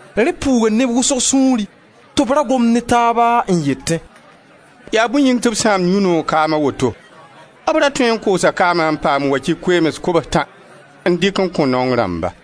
Rẽ puuga neb wʋsg sũuri tɩ b ra gomd ne taaba n yetẽ: «Yaa bõe yĩng tɩ b sãamd yũ-noog kaam a woto? B ra tõe n koosa kaama n paam wakɩ koeems kobs-tã n dɩk n kõ naong rãmba.»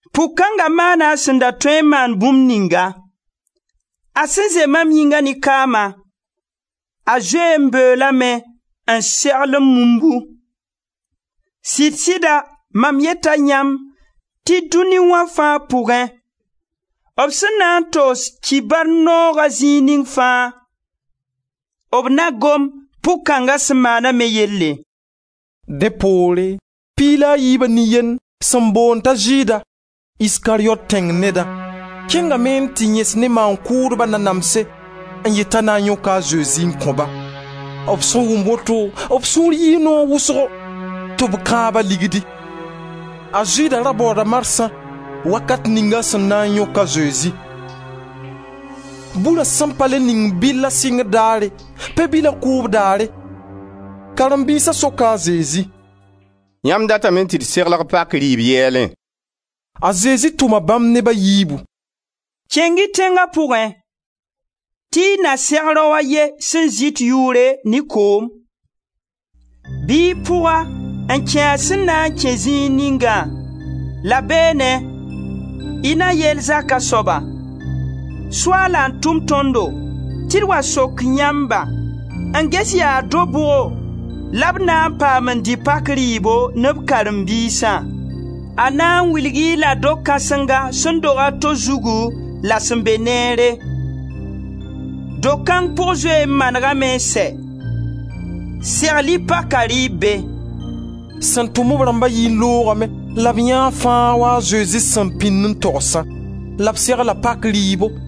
Pʋg kãnga maana a sẽn da tõe n maan bũmb ninga. A sẽn zɛ mam yĩnga ne kaama, a zoe n beoolame n segl m mumbu. Sɩd-sɩda mam yeta yãmb tɩ dũni wã fãa pʋgẽ, b sẽn na n togs Kibar nooga zĩig ning fãa, b na gom pʋg kãnga sẽn maana me yelle.» Dẽ poore, piig la a yiiba nin-yend sẽn boond tɩ Zɩɩda, Iskariyot tẽng neda, kẽngame n tɩ yẽs ne maan-kʋʋdba nanamse n yet t'a na yõk a Zezi n kõ-ba. B sẽn wʋm woto, b sũur yɩɩ noog wʋsgo tɩ b kãab-a ligdi. A Zɩɩda ra baooda marsã, wakat ning a sẽn na n yõk a Zezi. Bura sẽn pa le ningd bɩlla sɩngr daare, pe-bila kʋʋb daare, karen-biisa soka a Zezi: «Yãmb datame tɩ d segl pak rɩɩb yɛɛlẽ?» A Zezi tʋma bãmb neb a yiibu: «Kẽng-y tẽnga pʋgẽ tɩ y na seg rao a ye sẽn zɩt yʋʋre ne koom. Bɩ y pʋg-a n kẽ a sẽn na n kẽ zĩig ningã la beene, y na yeel zaka soaba: ‹Soaala n tʋm tõndo tɩ d wa sok yãmba n ges yaa do-bʋgo la b na n paam n dɩ pak rɩɩbo ne b karen-biisã?› A na n wilg-y-la do-kãsenga sẽn dog a to zugu la sẽn be neere. Do-kãng pʋg zoe n manegame n sɛ. Segl-y paka rɩɩb be.» Sẽn tʋm b rãmba yii n loogame la b yãee fãa w-a a Zezi sẽn pĩn n togsã la b segla paka rɩɩbo.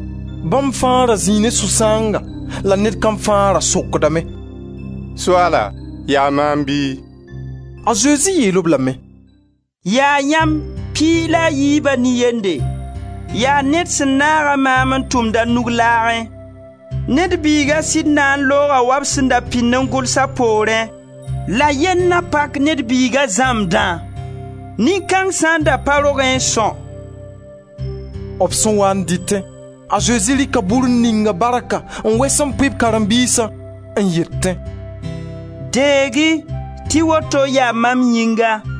Bãmb fãa ra zĩi ne sũ-sãanga la ned kam fãa ra sokdame: «Soaala, yaa maam bɩ?» A Zezi yeel-b lame: «Yaa yãmb piig la a yiibã nin-yende, yaa ned sẽn naaga maam n tʋmd a nug laagẽ. Ned Biiga sɩd na n looga wa b sẽn da pĩnd n gʋls a poorẽ, la yell na pak Ned Biiga zãmbdã. Nin-kãng sã n da pa rogẽ n são.» B sẽn waa n dɩtẽ, a Zezi rɩka bur n ning-a barka n wes n pʋɩ b karen-biisã n yetẽ: «Deeg-y tɩ woto yaa mam yĩnga.»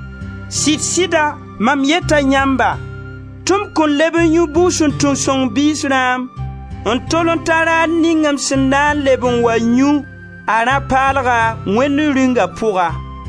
Sɩd-sɩda mam yeta yãmba tɩ m kõn leb n yũ bugsuntung sõng biis rãam n tol n ta raar ning m sẽn na n leb n wa yũ a rã paalga Wẽnd Rĩunga pʋga.»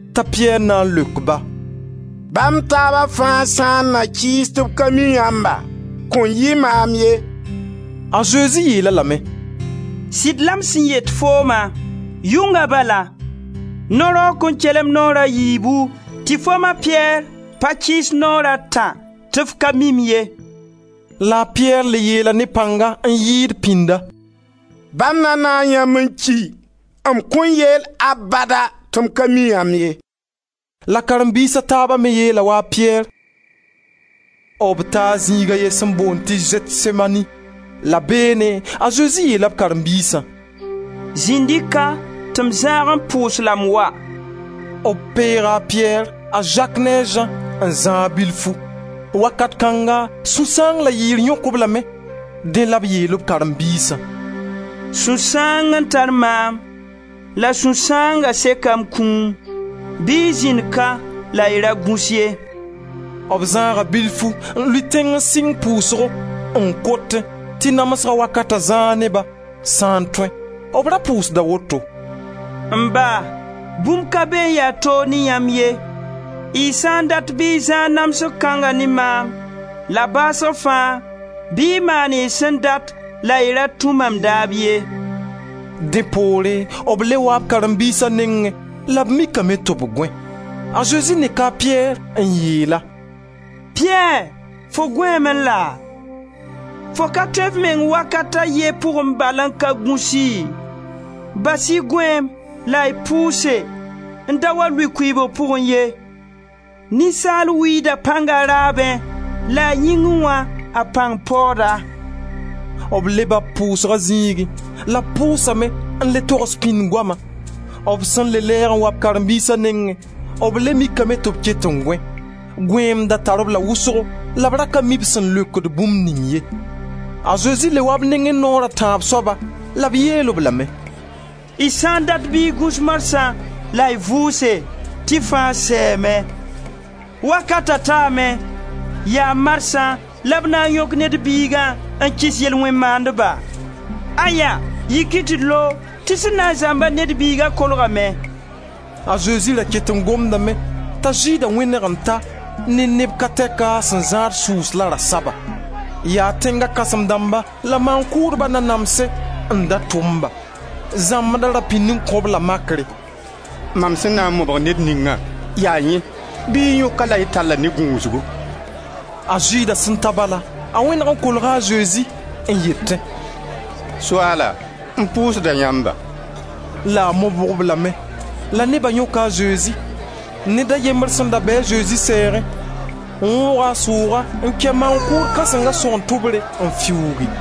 T'a Piyɛr na n leok-ba: «Ba m taaba fãa sã n na kɩɩs tɩ b ka mi yãmba, kõn yɩ maam ye.» A Zezi yeel-a lame: «Sɩd la m sẽn yet fooma: yʋnga bala no-raoog kõn kelem naoor a yiibu tɩ foom, a Piyɛr, pa kɩɩs naoor a tã tɩ f ka mi-m ye.» La a Piyɛr le yeela ne pãnga n yɩɩd pĩnda: «Ba m na naag yãmba n ki, m kõn yeel abada tɩ m ka mi yãmb ye.» La karen-biis a taaba me yeela wa a Piyɛr. B taa zĩig a ye sẽn boond tɩ Zɛtsemani la beene a Zezi yeela b karen-biisã: «Zĩnd-y ka tɩ m zãag n pʋʋs la m wa.» B peega a Piyɛr, a Zak ne a Zã n zãag bilfu. Wakat kãnga sũ-sãang la yɩɩr yõk-b lame. Dẽ la b yeel b karen-biisã: «Sũ-sãang n tar maam la sũ-sãanga seka m kũum. Bɩ y zĩnd ka la y ra gũs ye.» B zãaga bilfu n lʋɩ tẽng n sɩng pʋʋsgo, n kotẽ tɩ namsga wakata zãag ne-ba, sã n tõe. B ra pʋʋsda woto: «M Ba, bũmb ka be n ya toog ne yãmb ye. Y sã n dat bɩ y zãag namsg kãnga ne maam, la baasg fãa, bɩ y maan y sẽn dat la y ra tũ mam daab ye.» Dẽ poore b le waa b karen-biisa nengẽ la b mikame tɩ b gõe. A Zezi neka a Piyɛr n yeel-a: «Piyɛr, fo gõeeme laa? Fo ka tõe f meng wakat a ye pʋgẽ bal n ka gũsi? Bas-y gõeem la y pʋʋse n da wa lʋɩ kʋɩɩbg pʋgẽ ye. Ninsaal wɩɩda pãng a raabẽ, la yĩngẽ wã, a pãng paooda.» B leba b pʋʋsga zĩigẽ la b pʋʋsame n le togs pĩnd goama. B sẽn le lɛɛg n wa karen-biisa nengẽ, b le mikame tɩ b ket n gõe. Gõeem da tar-b la wʋsgo la b ra ka mi b sẽn leokd bũmb ning ye. A Zezi le waa b nengẽ naoor a tãab soaba la b yeel-b lame: «Y sã n dat bɩ y gũs marsã la y vʋʋse tɩ fãa sɛɛme. Wakata taame; yaa marsã la b na n yõk Ned Biiga n kɩs yel-wẽn-maandba. Aya! Yik-y tɩ d loog tɩ sẽn na n zãmba Ned Biiga kolgame.» A Zezi da ket n gomdame t'a Zɩɩda wẽneg n ta ne neb ka tɛk sẽn zãad sʋʋs la rasaba. Yaa tẽnga kãsem dãmba la maan-kʋʋdba nanamse n da tʋm-ba. Zãmbda ra pĩnd n kõ-b la makre: «Mam sẽn na n mobg ned ningã, yaa yẽ, bɩ y yõk-a la y tall-a ne gũusgu.» A Zɩɩda sẽn ta bala, a wẽneg n kolga a Zezi n yetẽ: «Soaala, m pʋʋsda yãmba.» La a mobg-b lame. La neba yõka a Zezi. Ned a yembr sẽn da be a Zezi sɛɛgẽ wõoga a sʋʋga n kɛ maan-kʋʋd kãsenga sõgen tʋbre n fiuugi.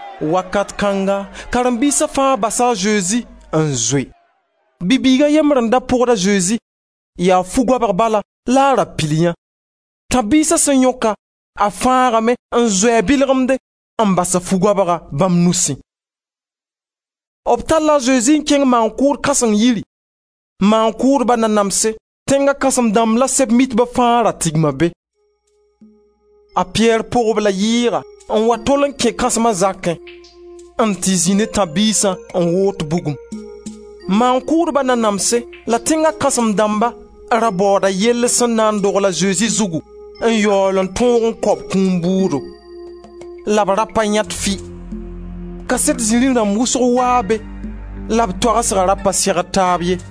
Wakat kãnga karen-biisa fãa basa a Zezi n zoe. Bi-bɩɩg a yembr n da pʋgd a Zezi. Yaa fu-goabg bal la a ra pil yã. Tãb-biisa sẽn yõk-a, a fãagame n zoe a bɩlgemde, n bas fu-goabga bãmb nusẽ. B talla a Zezi n kẽng maan-kʋʋd kãseng yiri. Maan-kʋʋdba nanamse, tẽnga kãsem-dãmb la Sɛb-mitba fãa ra tigma be. A Piyɛr pʋg-b la yɩɩga n wa tol n kẽ kãsma zakẽ n tɩ zĩ ne tãb-biisã n woot bugum. Maan-kʋʋdba nanamse la tẽnga kãsem dãmba ra baooda yell sẽn na n dogl a Zezi zugu n yaool n tõog n kao b kũum bʋʋdo, la b ra pa yãet fɩ. Kaset-zirẽ dãmb wʋsg waa be, la b toagsga ra pa segd taab ye.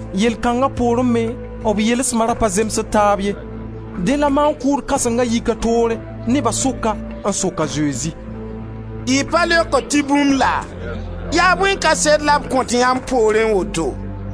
Yell kãnga poorẽ me b yelsma da pa zemsd taab ye. Dẽ la maan-kʋʋd kãsenga yik a toore neba sʋka n sok a Zezi: «Y pa leokd tɩ bũmb laa? Yaa bõe kaset la b kõt yãmb poorẽ woto?»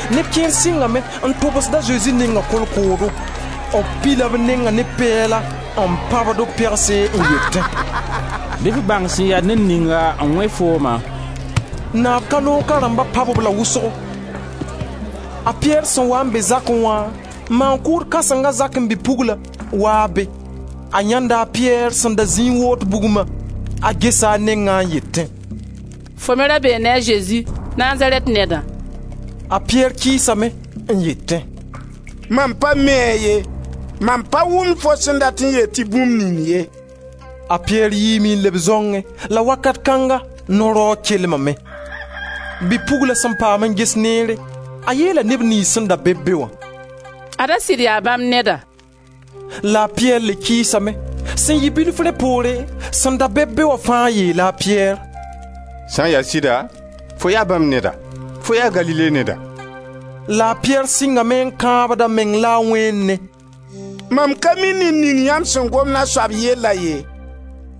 Neb kẽer sɩngame n tʋbsd a Zezi neng ne kolkoodo. B pila b neng ne pɛɛla n pãbd-b pegse n yetẽ: «Bɩ f bãng sẽn ya ned ninga n wẽ fooma!» Naab ka loog ka rãmba pãb-b la wʋsgo. A Piyɛr sẽn waa n be zakẽ wã, maan-kʋʋd kãseng zakẽ, bi-pugl n wa be. A yãenda a Piyɛr sẽn da zĩi n woot bugma, a gesa a neng n yetẽ: «Fo me ra bee ne a Zezi, Nazarɛt nedã.» A Piyɛr kɩɩsame n yetẽ: «Mam pa mi-a ye. Mam pa wʋmd fo sẽn dat n yeel tɩ bũmb ning ye.» A Piyɛr yiime n leb zãongẽ, la wakat kãnga no-raoog kelmame. Bi-pugla sẽn paam n ges neere, a yeela neb niyns sẽn da be-b be wã: «Ad-a sɩd yaa bãmb neda.» La a Piyɛr le kɩɩsame. Sẽn yɩ bilfu rẽ poore, sẽn da be-b be wã fãa yeela a Piyɛr: «Sã n ya sɩda, fo yaa bãmb neda, fo yaa Galile neda.» La a Piyɛr sɩngame n kãabd a meng la wẽene: «Mam ka mi ned ning yãmb sẽn gomd a soab yella ye.»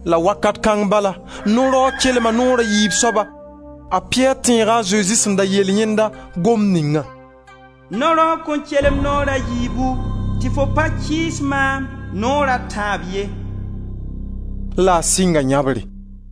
La wakat kãng bala no-raoog kelma naoor a yiib soaba. A Piyɛr tẽega a Zezi sẽn da yeel yẽnd gomd ninga: «No-raoog kõn kelem naoor a yiibu tɩ fo pa kɩɩs maam naoor a tãab ye.» La a sɩnga yãbre.